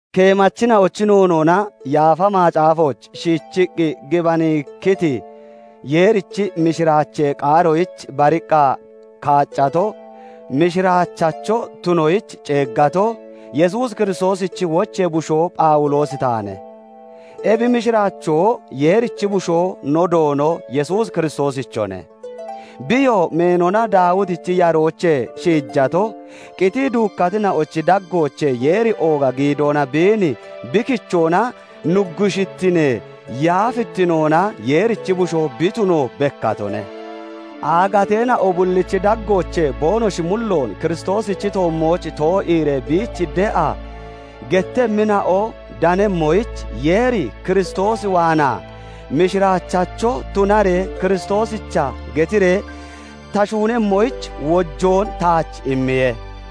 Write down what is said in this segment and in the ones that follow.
Keemachina'ochi noonoona Yaafa Macaafooch shiichiqqi gibanikkiti Yeerichi mishiraachee qaaroyich bariqqa kaaccato, mishiraachacho tunoyich ceeggato, Yesuus Kiristoosichi wochee bushoo Phawuloosi taane. Ebi mishiraachoo Yeerichi Bushoo no Doono Yesuus Kiristoosichone. Biyoo meenona Daawitichi yaroochee shiijato, qitii duukkatina'ochi daggoochee Yeeri ooga giidoona biin bi kichoona nuggushittinee yaafittinoona Yeerichi Bushoo bi tuno bekkatone. Aagateena'o bullichi daggoochee boonoshi mulloon Kiristoosichi toommooch too'iiree biich de'a gettemmina'o danemmoyich, Yeeri Kiristoos waanaa mishiraachachoo tunaree Kiristoosicha getiree ta shuunemmoyich, wojoon taach immiye.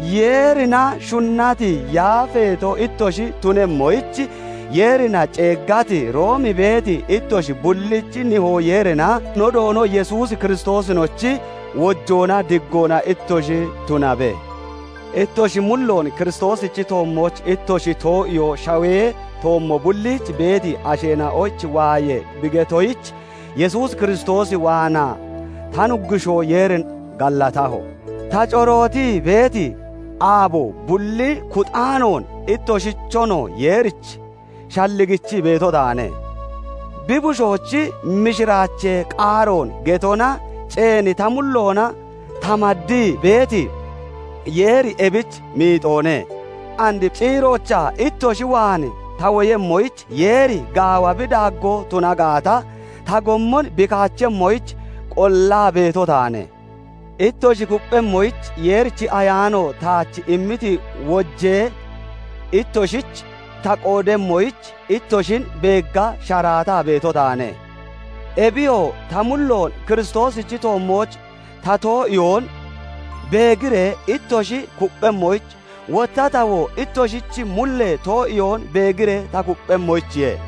Yeerina shunnati, yaafeeto ittoshi tunemmoyich Yeerina ceeggati, Room beeti ittoshi bullich; Nihoo Yeerinaa no Doono Yesuus Kiristoosinochi wojoonaa diggoona ittoshich tunabe. Ittoshi mulloon Kiristoosichi toommooch ittoshi too'iyoo shawee toommo bulliich beeti asheena'oyich waayee bi beetoyich, Yesuus Kiristoos waanaa ta Nuggushoo Yeerin gallatahoye. Ta corootii beeti aabo bullin kuxaanoon ittoshichon Yeerich shalligichii beeto taane; bi Bushoochi mishiraachee qaaroon getona ceeni ta mulloona ta maddii (maddaa) beeti Yeeri ebich miixoone. And ciiroochaa ittoshi waan ta woyemmoyich Yeeri gaawa bi daaggoo tuna gaata, ta gommon bi kaachemmoyich qollaa beeto taane. Ittoshi kupphemmoyich Yeerichi Ayaano taach immiti wojoochee ittoshich ta qoodemmoyich ittoshin beegga sharaataa beeto taane. Ebiyoo ta mulloon Kiristoosichi toommooch ta too'iyoon beegiree ittoshi kupphemmoyich, wotta tawoo ittoshichi mullee too'iyoon beegiree ta kupphemmoyichiye.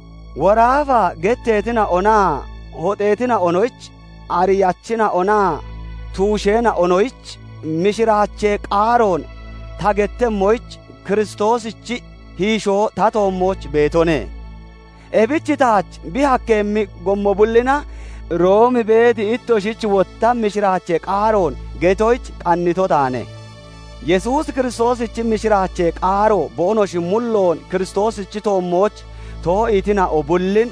"Woraafa" getteetina'onaa hoxeetina'onoyich, ariyachina'onaa tuusheena'onoyich mishiraachee qaaroon ta gettemmoyich, Kiristoosichi hiishoo ta toommooch beetone. Ebich taach bi hakkeeyemmi gommo bullina Room beeti ittoshich wotta mishiraachee qaaroon getoyich qannito taane. Yesuus Kiristoosichi mishiraachee qaaro boonoshi mulloon Kiristoosichi toommooch too'iitina'o bullin,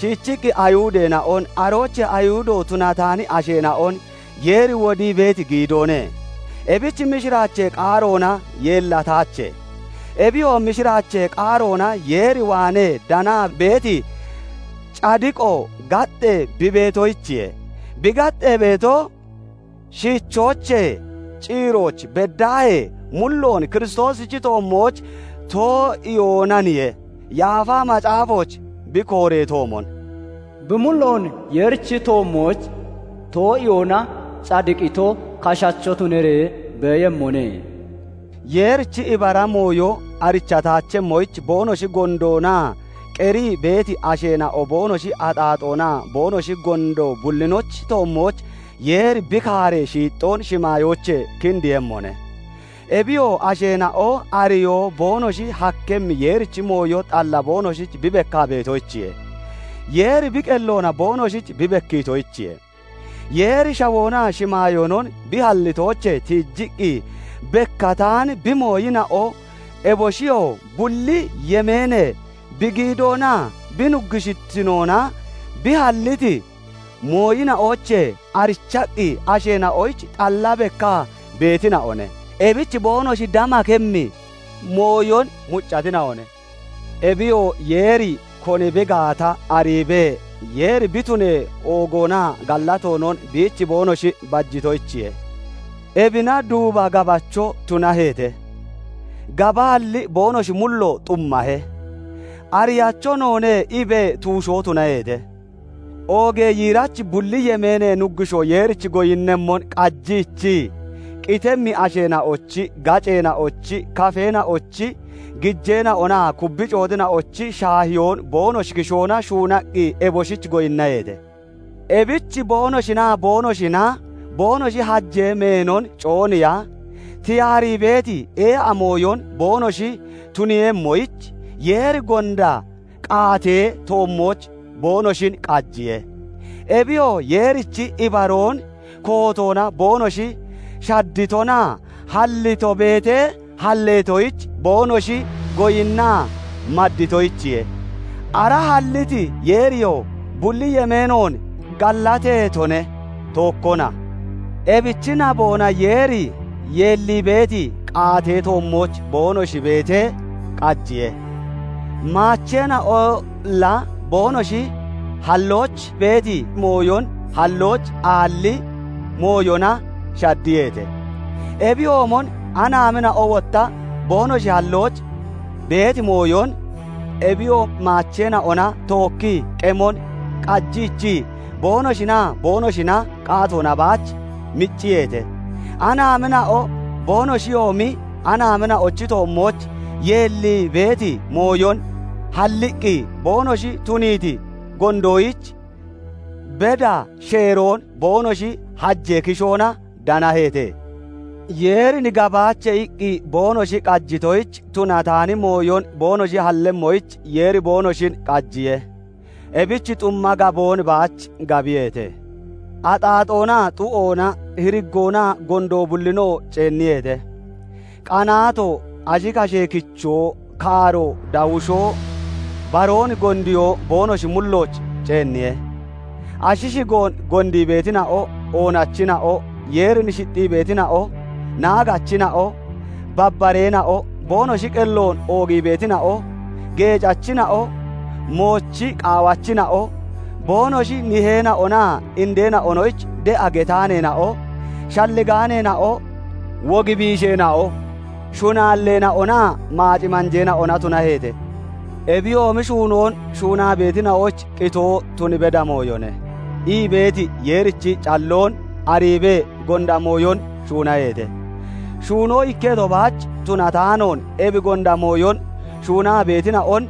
shiichiqqi Ayihudeena'on, aroochee Ayihudo tunataani asheena'on Yeeri wodii beeti giidoone. Ebich mishiraachee qaarona yeellataache. Ebiyoo mishiraachee qaaroona Yeer waanee danaa beeti cadiqo gaxxee bi beetoyichiye; bi gaxxee beeto, shiichoochee ciirooch beddaahee mulloon Kiristoosichi toommooch too'iyoonaniye. Yaafa Macaafooch bi kooreetoomon, "Bi mulloon Yeerichi toommooch too'iyoona cadiqito kashacho tunaree beeyemmone." Yeerichi ibara mooyo arichataachemmoyich boonoshi gondoona qerii beeti asheena'o boonoshi axaaxoonaa boonoshi gondo bullinochi toommooch Yeeri bi kaaree shiixxoon shimaayoochee kindiiyemmone; Ebiyoo asheena'o ariyoo boonoshi hakkemmi Yeerichi mooyo xalla boonoshich bi bekkaa beetoyichiye; Yeeri bi qelloona boonoshich bi bekkiitoyichiye. Yeeri shawoonaa shimaayoonon bi hallitoochee tiijiqqi bekkataani bi mooyina'o, eboshiyoo bulli yemeenee bi giidoonaa bi nuggushittinoona, bi halliti mooyina'oochee arichaqqi asheena'oyich xalla bekkaa beetina'one; ebich boonoshi damakemmi (damatehi) mooyon muccatina'one. Ebiyoo Yeeri koni bi gaata ariibee, Yeeri bi tunee oogoonaa gallatoonon biich boonoshi bajitoyichiye. Ebina duuba gabacho tunaheete; gabaalli boonoshi mullo xummahe. "Ariyacho noone" iibee tuushoo tunaheete; oogee yiirachi bulli yemeenee Nuggushoo Yeerich goyinnemmon qajiichii, qitemmi asheena'ochi, gaceena'ochi, kafeena'ochi, gijeena'onaa kubbi cooxina'onochi shaahiyoon boonoshi kishoona shuunaqqi eboshich goyinnaheete. Ebich boonoshinaa boonoshina boonoshi hajee meenon cooniiya, tiyaarii beeti ee'a mooyon boonoshi tuniiyemmoyich, Yeeri gonda qaatee toommooch boonoshin qajiye. Ebiyoo Yeerichi ibaroon kootoona boonoshi shadditonaa hallito beetee halleetoyich boonoshi goyinnaa madditonoyichiye. Ara halliti Yeeriyoo bulli yemeenoon gallateetone; tookkona. Ebichi naboona Yeeri yeellii beeti qaatee toommooch boonoshi beetee qajiye. Maacheena'olla boonoshi hallooch beeti mooyon hallooch aalli mooyona shaddiyeete. Ebiyoomon anaamina'o wotta boonoshi hallooch beeti mooyon, ebiyoo maacheena'ona tookkii qemon qajiichii, boonoshinaa boonoshina qaatoona baach micciyeete. Anaamina'o boonoshiyoomi anaamina'ochi toommooch yeellii beeti mooyon halliqqi boonoshi tuniiti gondoyich beda sheeroon boonoshi hajee kishoona danaheete. "Yeerin gabaache" iqqi boonoshi qajitoyich, tunataani mooyon boonoshi hallemmoyich, Yeeri boonoshin qajiye; ebich xumma gaboon baach gabiyeete. Axaaxoona, xu'oona, hiriggoona, gondoo bullinoo ceenniyeete; qanaato, ashi kashee kichoo, kaaro, dawushoo, baroon gondiyoo boonoshi mullooch ceenniye. Ashi shigoon gondii beetina'o, oonachina'o, Yeerin shixxii beetina'o, naagachina'o, babbareena'o, boonoshi qelloon oogii beetina'o, geecachina'o, moochi qaawachina'o, boonoshi niheena'onaa indeena'onoyich de'a getaaneena'o, shalligaalleena'o, wog biisheena'o, shunaalleena'onaa maac manjeena'ona tunaheete. "Ebiyoomi shuunoon shuunaa beetina'oyich qitoo tun beda mooyone" ii beeti Yeerichi calloon ariibee gonda mooyon shuunaheete; shuuno ikketo baach tunataanoon, ebi gonda mooyon shuunaa beetina'on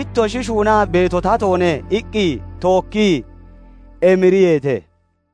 "Ittoshi shuunaa beeto tatoone!" iqqi tookkii emiriyeete.